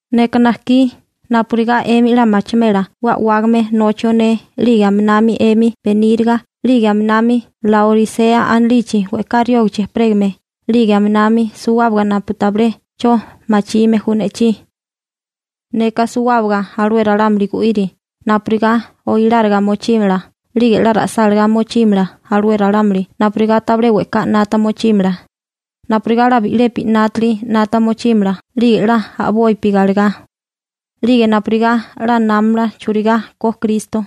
Neka najkí napurigá 'emi 'la machimela 'we a'wágame nochio ne 'lige aminami 'emi beníriga 'lige aminami Laorisea anilichi we'ká riógichi ejperégame 'lige aminami suwábaga napu tabilé 'cho machime ju ne'chí. Neka suwábaga alué ralámuli gu'iri napurigá oiláriga mochímala 'lige 'la ra'sálagá mochímala alué ralámuli napurigá tabilé we'ká 'nata mochímala, napurigá 'la bi'lepi 'nátili 'nata mochímala 'lige 'la a'bopi galegá, 'lige napurigá 'la námamala churigá ko Kristo.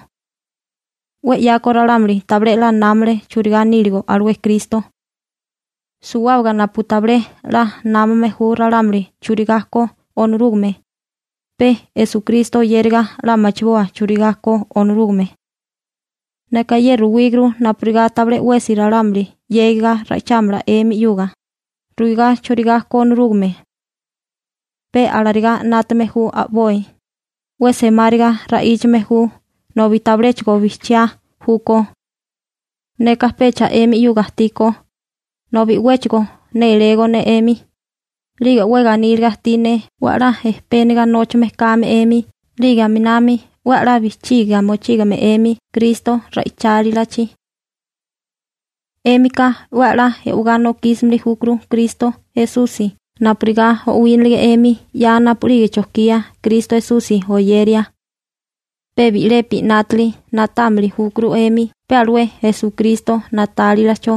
'We 'yako ralámuli tabilé 'la námale churigá níligo alué Kristo. Suwábaga napu tabilé 'la námame ju ralámuli churigá ko Onorúgame, pe Esukristo oyériga 'la machiboa churigá ko Onorúgame. Neka ye ruwíguru napurigá tabilé 'wesi ralámuli 'yégaga ra'ichámala 'emi 'yuga, ruigá churigá ko Onorúgame. Pe alarigá 'nátame ju a'boi, 'we semáriga ra'íchame ju nobi tabiléchigo bijchiá júkó. Neka pecha 'emi 'yuga ajtí ko, nobi 'wéchigo nélégó ne 'emi, 'lige 'we ganíliga ajtí ne 'we a'lá ejpéniga nóchame kame 'emi, 'lige aminami 'we 'la bijchigia mochígame 'emi Kristo ra'ichálilachi. 'Émika 'we a'lá e'wegá nokísimili júkuru Kristo Esusi napurigá o'wínilige 'emi 'ya napu'lige chojkía Kristo Esusi oyeria. Pe bi'lepi 'nátili na'támili júkuru 'emi pe alué Esukristo na'tálilacho,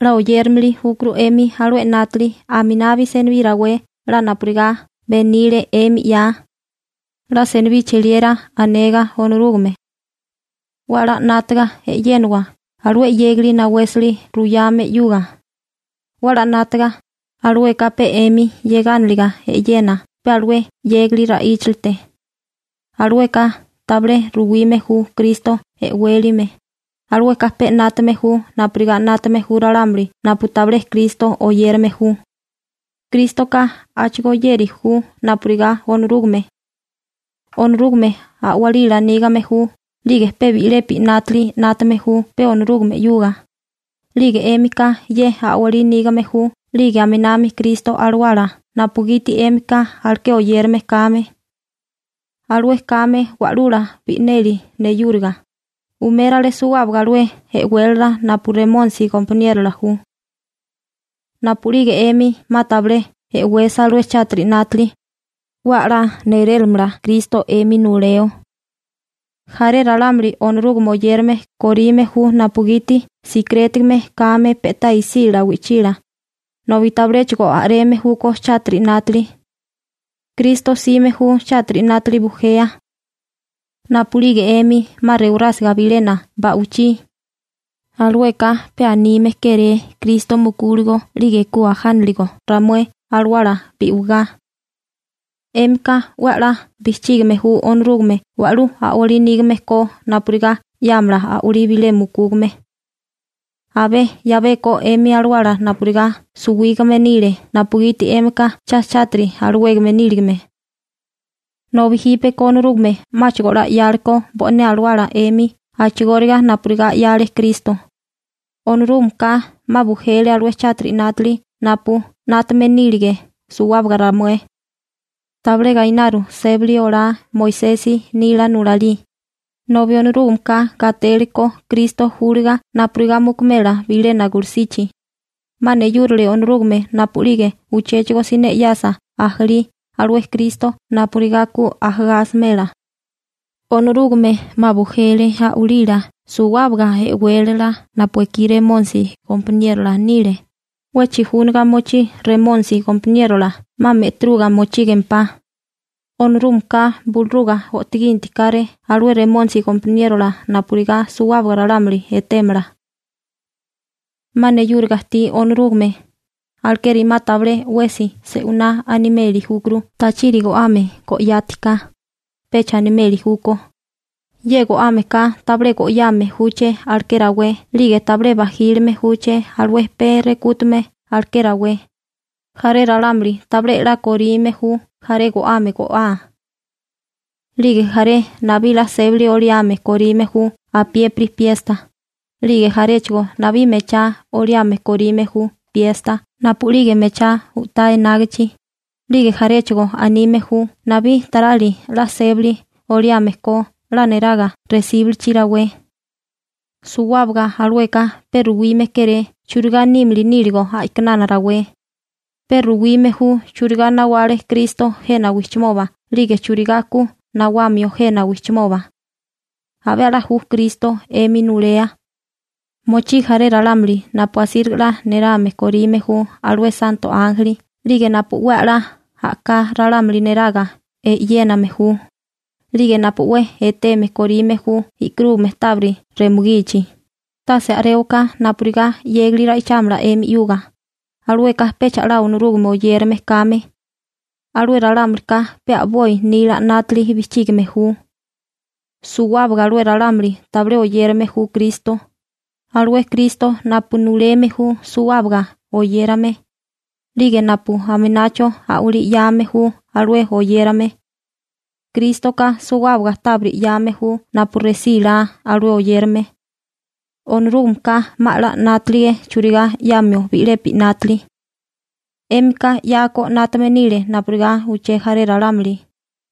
'la oyérimili júkuru 'emi alué 'nátili aminabi senibí rawé 'la napurigá benile 'emi 'ya, 'la senibí cheliera anega Onorúgame. 'We a'lá 'nátiga e'yéniwa alué 'yégali nawésali ruyame 'yuga. 'We 'la 'nátaga, alueka pe 'emi 'yegániliga e'yena pe alué 'yégali ra'íchalite. Alueka tabilé ruwime ju Kristo e'wélime, alueka pe 'nátame ju napurigá 'nátame ju ralámuli napu tabilé Kristo oyérame ju. Krístoka a'chigóyéri ju napurigá Onorúgame. Onorúgame a'walila nígame ju 'lige pe bi'lepi 'nátili 'nátame ju pe Onorúgame 'yuga. 'Lige 'émika ye a'walí nígame ju 'lige aminami Kristo Alawala napugiti 'émika aleké oyérame kame. Alué kame Wa'lula bi'neli neyúriga, umérale suwábaga alué e'wélala napu Remónisi gompaniérola ju. Napu'lige 'emi 'ma tabilé e'wesa alué chátiri 'nátili, 'we 'la néléramala Kristo 'emi nuleo. Jaré ralámuli Onorúgame oyérame korime ju napugiti sikirétigame kame pe'tá isílala wi'chila, nobi tabiléchigo a'reme júkó chátiri 'nátili. Kristo 'sime ju chátiri 'nátili bujea. Napu'lige 'emi 'ma rewarásiga bilena ba'wichí, alueka pe anime kéré Kristo mukúligo 'lige ku ajániligo ramué alawala bi'wigá. 'Émika 'we 'la bijchígime ju Onorúgame wa'lú a'walí nígame ko napurigá 'yámala a'walí bilé mukúgame. Abé 'yabeko 'emi alawala napurigá suwígame nile napugiti 'émika cha chátiri alawégame níligame. Nobi jípeko Onorúgame 'máchigo 'la 'yáleko bo'né alawala 'emi a'chigóriga napurigá 'yale Kristo. Onorúgameka 'ma bujele alué chátiri 'nátili napu 'nátame nírige suwábaga ramué. Tabilé gainaru sébali olá Moisesi nila nulalí, nobi Onorúgameka gatélekó Kristo júliga napurigá mukumela bilena gulusichi. 'Ma neyúrile Onorúgame napu'lige uchéchigo siné 'yasa ajalí alué Kristo napurigá ku ajagá asimela. Onorúgame 'ma bujele a'walila suwábaga e'wélala napu ekí Remónisi gompaniérola nile. 'We chijúniga mochí Remónisi gompaniérola 'ma me'tiruga mochígempá. Onorúgameka buluruga o'toginti káré alué Remónisi gompaniérola napurigá suwábaga ralámuli etémala. 'Ma neyúriga ajtí Onorúgame, alekeri 'ma tabilé 'wesi se'winá animeli júkuru tachiri go'ame go'yátiká, pecha animeli júkó: ye go'ámeka tabilé go'yame júché aleké rawé, 'lige tabilé bajílime júché alué pee rekútume aleké rawé. Jaré ralámuli tabilé 'la korime ju jaré go'ame go'á. 'Lige jaré nabí 'la sébali oliame korime ju apiépiri piesta, 'lige jaréchigo nabí mechá oliame korime ju piesta napu'lige mechá u'tá enágichi, 'lige jaréchigo anime ju nabí tarali 'la sébali oliame ko 'la neraga resíbilichi rawé. Suwábaga alueka pe ruwime kéré churigá nímili níligo a'kinana rawé, pe ruyame ju churigá nawale Kristo jena wijchimoba 'lige churigá ku nawamio jena wijchimoba. Abé 'la ju Kristo 'emi nulea. Mochí jaré ralámuli napu asíriga 'la nerame korime ju alué santo ánjeli 'lige napu 'we a'lá a'ká ralámuli neraga e'yéname ju, 'lige napu 'we eteme korime ju e'karúgame tábiri remugichi, tase a'réwaká napurigá 'yégali ra'ichámala 'emi 'yuga, alueka pecha 'la Onorúgame oyérame kame. Alué ralámulika pe a'boi nila 'nátili bijchígime ju. Suwábaga alué ralámuli tabilé oyérame ju Kristo, alué Kristo napu nuleme ju suwábaga oyérame, 'lige napu aminacho a'walí 'yame ju alué oyérame. Krístoka suwábaga tábiri 'yame ju napu resílá alué oyérame. Onorúgameka 'ma 'la 'nátalige churigá 'yamio bi'lepi 'nátili. 'Émika 'yako 'nátame nile napurigá uché jaré ralámuli,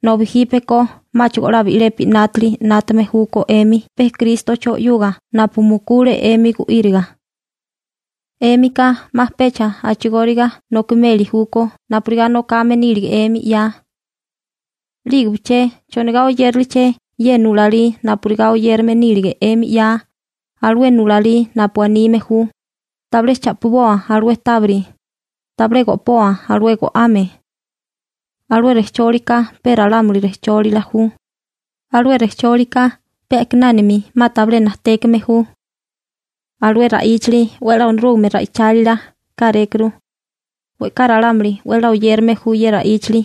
nobi jípeko 'máchigo 'la bi'lepi 'nátili 'nátame júkó 'emi pe Krístocho 'yuga napu mukule 'emi gu'íriga. 'Émika 'ma pecha a'chigóriga nokimeli júkó napurigá nokame nílige 'emi 'ya. ¿'Lígebiché chonigá oyériliaché ye nulalí napurigá oyérame nílige 'emi 'ya, alué nulalí napu anime ju: «¿Tabilé cha'piboa alué tábiri, tabilé go'poa alué go'ame?» Alué rejchólika pe ralámuli rejchólila ju, alué rejchólika pe a'kinánami 'ma tabilé najtékame ju. Alué ra'íchali 'we 'la Onorúgame ra'ichálila kárékuru. We'ká ralámuli 'we 'la oyérame ju ye ra'íchali.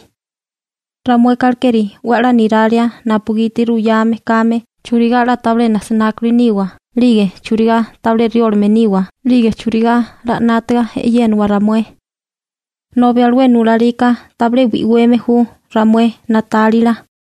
Ramueka alekeri 'we 'la niralia napugiti ruyame kame churigá 'la tabilé nasinákuli niwa, 'lige churigá tabilé riólame niwa, 'lige churigá 'la 'nátaga e'yénawa ramué. Nobi alué nulalika tabilé bi'weme ju ramué na'tálila.